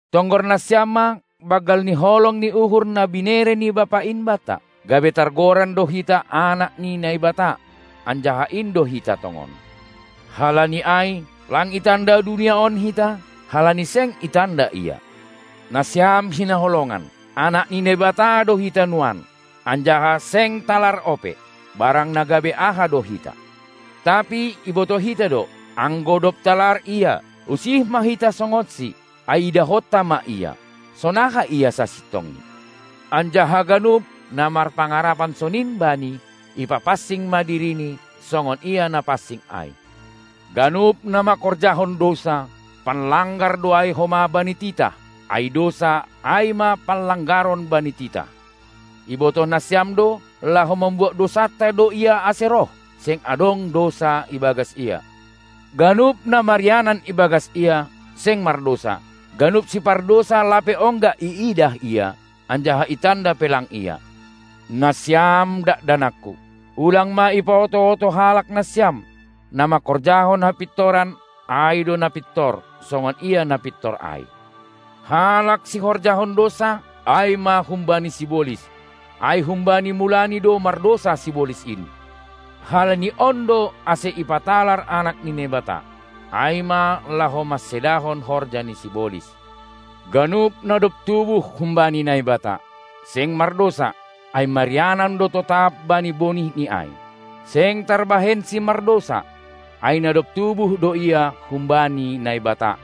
Tonggor nasiam ma banggal ni holong ni uhur na binere ni Bapa in banta, gabe targoran do hita anak ni Naibata, anjaha in do hita tongon. Halani ai, lang itanda dunia on hita, halani seng itanda Ia. Nasiam hinaholongan, anak ni Naibata do hita nuan, anjaha seng talar ope, barang na gabe aha do hita; tapi ibotoh hita do, anggo dob talar Ia, usih ma hita songonSi, ai idahonta ma Ia, sonaha Ia sasintongni. Anjaha ganup, na marpangarapan sonin Bani, ipapansing ma dirini, songon Ia na pansing ai. Ganup na manghorjahon dousa, panlanggar do ai homa bani titah, ai dousa, ai ma panlanggaron bani titah. Ibotoh nasiam do, laho mambuat dousanta do Ia ase roh; seng adong dousa ibagas Ia. Ganup na marianan ibagas Ia, seng mardousa; ganup sipardousa lape ongga iidah Ia, anjaha itanda pe lang Ia. Nasiam dakdanakku, ulang ma ipaoto-oto halak nasiam. Na manghorjahon hapintoran, ai do na pintor, songon Ia na pintor ai. Halak sihorjahon dousa ai ma humbani sibolis, ai humbani mulani do mardousa sibolis in. Halani on do ase ipatalar Anak ni Naibata, ai ma laho mansedahon horja ni sibolis. Ganup, na dob tubuh humbani Naibata, seng mardousa, ai marianan do totap bani bonih ni ai. Seng tarbahensi mardousa, ai na dob tubuh do ia humbani Naibata.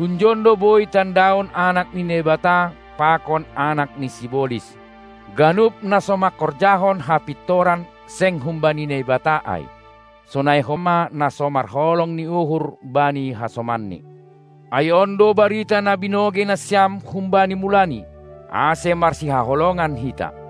Hunjon do boi tandaon anak ni Naibata pakon anak ni sibolis: Ganup na so manghorjahon hapintoran seng humbani Naibata ai, sonai homa na so marholong ni uhur bani hasomanni. Ai on do barita na binogei nasiam humbani mulani, ase marsihaholongan hita.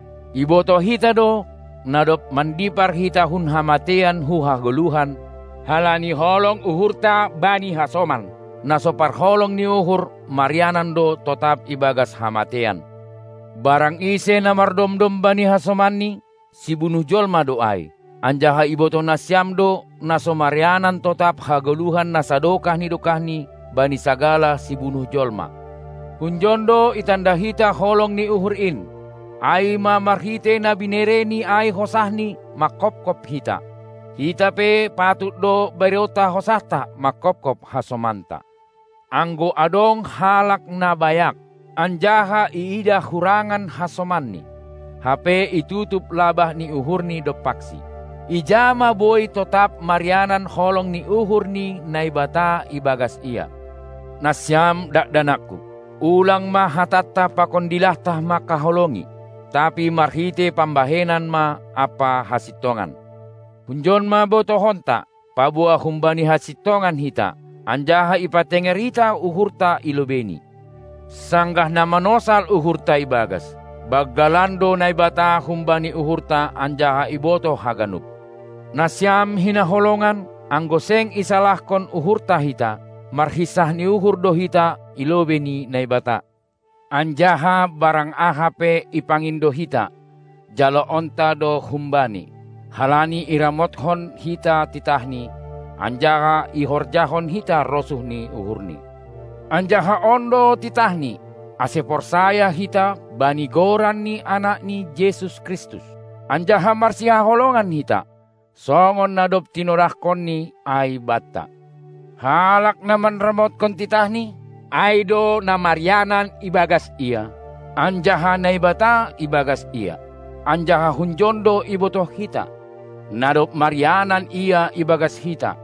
Ibotoh hita do, na dob mandipar hita hun hamateian hu hagoluhan, halani holong uhurta bani hasoman. Na so parholong ni uhur, marianan do totap ibagas hamateian. Barang ise na mardomdom bani hasomanni, sibunuh jolma do ai, anjaha ibotoh nasiam do, na so marianan totap hagoluhan na sadokah ni dokahni bani sagala sibunuh jolma. Hunjon do itanda hita holong ni uhur in, ai ma marhitei na binereni ai hosahNi manghophop hita. Hita pe patut do bereonta hosahta manghophop hasomanta. Anggo adong halak na bayak, anjaha iidah hurangan hasomanni, hape itutup labah ni uhurni dompaksi, ija ma boi totap marianan holong ni uhur ni Naibata ibagas ia? Nasiam dakdanakku, ulang ma hatanta pakon dilahta manghaholongi, tapi marhitei pambahenan ma ampa hasintongan. Hunjon ma botohonta, paboa humbani hasintongan hita, anjaha ipatenger hita uhurta i lobeini, sanggah na manosal uhurta ibagas: Banggalan do Naibata humbani uhurta anjaha ibotoh haganup. Nasiam hinaholongan, anggo seng isalahkon uhurta hita, marhinsah ni uhur do hita i lobei ni Naibata. Anjaha barang aha pe ipangindo hita, jaloonta do hum Bani, halani iramothon hita titahNi, anjaha ihorjahon hita rosuh ni uhurNi. Anjaha on do titahNi, ase porsaya hita bani Goran ni Anakni Jesus Kristus, anjaha marsihaholongan hita, songon na dob tinonahkonNi ai banta. Halak na manramotkon titahNi, ai do na marianan ibagas Ia, anjaha Naibata ibagas ia. Anjaha hunjon do ibotoh hita, na dob marianan Ia ibagas hita,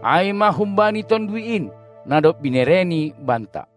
ai ma humbani Tonduy in, na dob binereNi banta.